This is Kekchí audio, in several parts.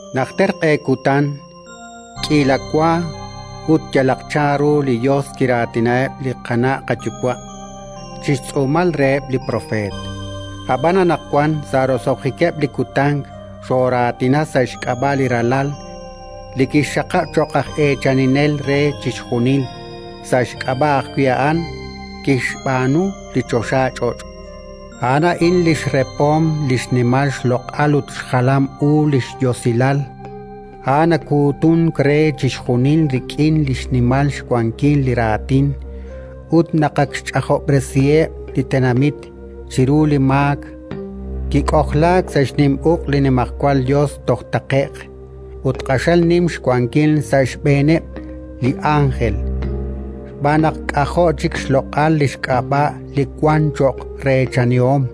Najter q'e kutan, k'iila wa ut yalaq chanru li Yos kiraatinaheb' li qana' qayuwa' chi xtz'uumal reheb' li propeet. Ab'an anaqwan, sa' roso'jikeb' li kutan, xooraatina sa' xk'ab'a' li Ralal, li kixxaqab' cho'q aj eechaninel re chixjunil; sa' xk'ab'a' ajwi' a'an kixb'aanu li choxach'och'. A'an a'in xrepom li xnimal xloq'al ut xjalam u li xYosilal. A'an nakuutunk re chixjunil rik'in xnimal xwankil li raatin, ut naq ak xch'ajob'resiheb' li tenamit chiru li maak, kik'ojlaak sa' xnim uq' li Nimajwal Yos toj taqe'q. Ut q'axal nim xwankil sa' xb'eeneb' li ánjel, xb'aan naq k'ajo' chik xloq'al li xk'ab'a' li wank cho'q reechanihom.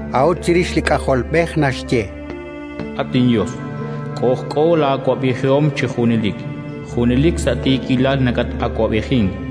A'ut chirix li K'ajolb'ej naxye: “At inYos, k'ojk'o laa'awab'ejihom chi junelik. Junelik sa' tiikilal nakatawab'ejink.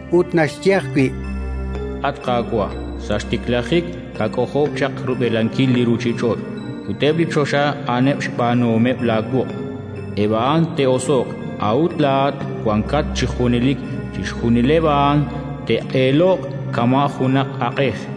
Ut naxye ajwi': “At Qaawa', sa' xtiklajik kak'ojob' chaq rub'elankil li ruuchich'och', ut eb' li choxa a'aneb' xb'aanuhomeb' laawuq'. Eb' a'an te'oso'q, a'ut laa'at wankat chi junelik. Chixjunileb' a'an te'q'eeloq kama' junaq aq'ej;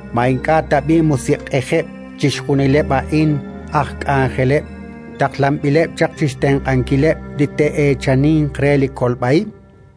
Ma ink'a' tab'i' musiq'ejeb' chixjunileb' a'in, aj k'anjeleb', taqlanb'ileb' chaq chi xtenq'ankileb' li te'eechaninq re li kolb'a ib'?